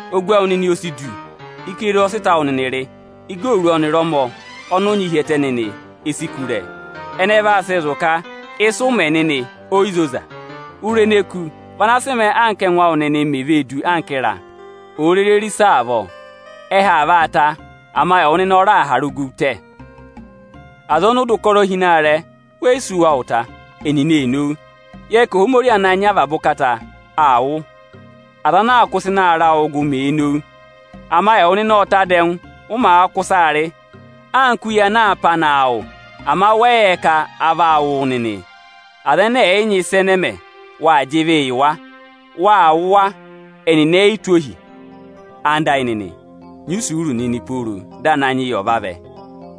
Ogu awụ nịnị o si du. Ikere ọ sị ịta awụ nịnị rị. Igooru ọnịrị ọmọ ọnị ụ nyị hi ẹtẹ nịnị, e si kú ụrẹ. Ẹnị ẹ vaa sị zụ̀ ka ịsị ụ mẹ nịnị, o yi zoza. Ụrẹ ene e kú, vị ana sị mẹẹ anka ẹngụ awụ nịnị mè vee du anka ịra òo rere rị ịsa avọọ. Ẹhẹ aa vaa tá, ama ẹwụ nịnị ọ raà hàrà ogu tẹ. Aza ọnị ụ dọ ụkọrọ hi ịnị aarẹ, we yi si wa ụta, ẹnịnị ee nowu. Yẹ nịnị ka Ohomorihi Ochẹtẹngụ, aa wụ́, aza ana aa kụ́ ịsa ịnị aarẹ awụụ gụ, mee nowu. Ama ẹwụ nịnị ọ́ọ ta dẹngụ, ụ maa kụ́ ịsaa rị, anka uye ana aa pá naa wụ; ama wẹ yị yẹ ka aa vaa wụ̀ wụ nịnị. Aza ẹnẹ ẹ̀ yị nyị ịsị ẹ mẹ̀, wâ jị ịvị yị wa, wâ wụ̀ wa, ẹnịnị e yi tụ́ ohi. Nyị isuuru nịnị! Ẹwụ nịnị ẹyịnyara amị, nyị isuuru nịnị pooro dị Ananyị yị ọ̀ vavẹ.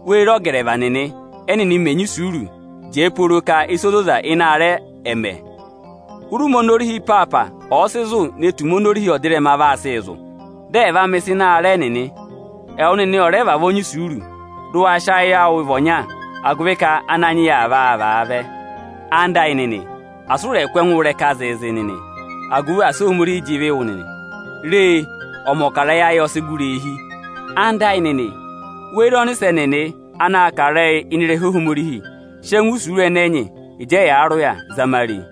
Wê re ọgẹrẹva nịnị, ẹnịnị mẹẹ̄ nyị isuuruu jẹẹ pooro ka ịsa ozoza ịnị aarẹ ẹnịnị ẹ̀ mẹ, hụrị ụmẹ oni orihi ịpaapa ọ̀ọ sị zụ̀ ne tù ụmẹ oni orihi ọdịrẹma vaa sịị zụ̀, dị ẹ̀ vaa mẹ̀ ịsa ịnị aarẹ ẹnịnị. Ẹwụ nịnị ọ̀ rẹ vavọọ nyị isuuru, dị ụ wa nyị ayị ọnya, agụvị ka Ananyị yị aa vaa vaa vẹ. Ẹwụ nịnị ẹyịnyara amị, asị ụ rẹ̀ kụ́ ẹngụụ ịrẹka zị nịnị! Re, ọmọkarẹyị ayị ọ sị gụrị eehi. Ẹwụ nịnị ẹyịnyara amị, wê re ọnịsẹ nịnị anaā kà ịrẹyị ịnị ịrẹha Ohomorihi; sị ẹngụ isuuru ẹnẹ nyị ịjị ẹyaa rị ụya zama a re!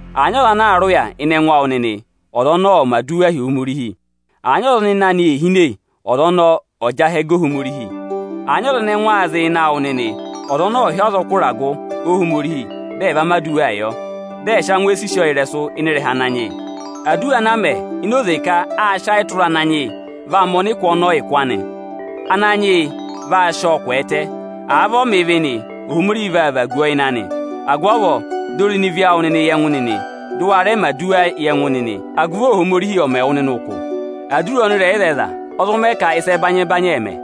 Àa nyị ọza anaa rị ụya ịnị ẹngụ awụ nịnị, ọza ọnọọ ọ̀ mẹ̀ aduwa hi Ohomorihi. Àa nyị ọza ọnị ịnẹ anị ee hine, ọza ọnọọ ọ̀ọ jị ahẹ ga Ohomorihi. Àa nyị ọza ẹnẹ ẹngụ aa zị ịnị ẹngụ awụ nịnị, ọza ọnọọ ọ̀ hị́ azọkụ ịragụ Ohomorihi, dị ẹ va aduwaa yọ, dị ẹ̀ sị angwẹ sisi ọ ịrẹsụ ịnị ịrẹha Ananyị yị. Aduwa ana àa mẹ ini oze ka aa sị ayị tụra ịrẹha Ananyị yị, vaa mẹ ọnịkụ ọnọọ ụkụ anị, Ananyị yị vaa sị ọọ kwẹẹtẹ. Àa vị ọ mẹ ịvị nị, Ohomorihi vaa vaagu ọ ịnị anị. Agụvị avọọ, dọ irenu ịvị awụ yị ẹngụ nịnị, dị ụ wa rẹ mẹ̀ aduwaa yị ẹngụ nịnị, agụvị Ohomorihi ọ̀ mẹ wụ nịnị ụkụ. Aduwa ọnịrẹyịzẹyịza ọ zụ mẹ ka ịsa ẹbanyị-ẹbanyị ẹ̀ mẹ.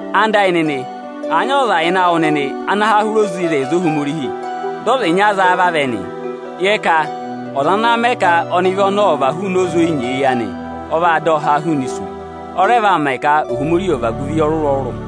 Ẹwụ nịnị ẹyịnyara amị, àa nyị ọza ịnị awụ nịnị ana há hụrị oze ịzẹyịza Ohomorihi, dị ọza ịnya za a vavẹ nị, Ipi 4.8yẹ ka ọza ana mẹ ka ọnịvị ọ̀ và hụụnị oze oni o zi nyeeyi, ọ vaa dọ ọ há hụụnị isu. Ọ rẹ vaa mẹ ka Ohomorihi ọ̀ vagu ịvị ọrụrụ-ọrụrụ.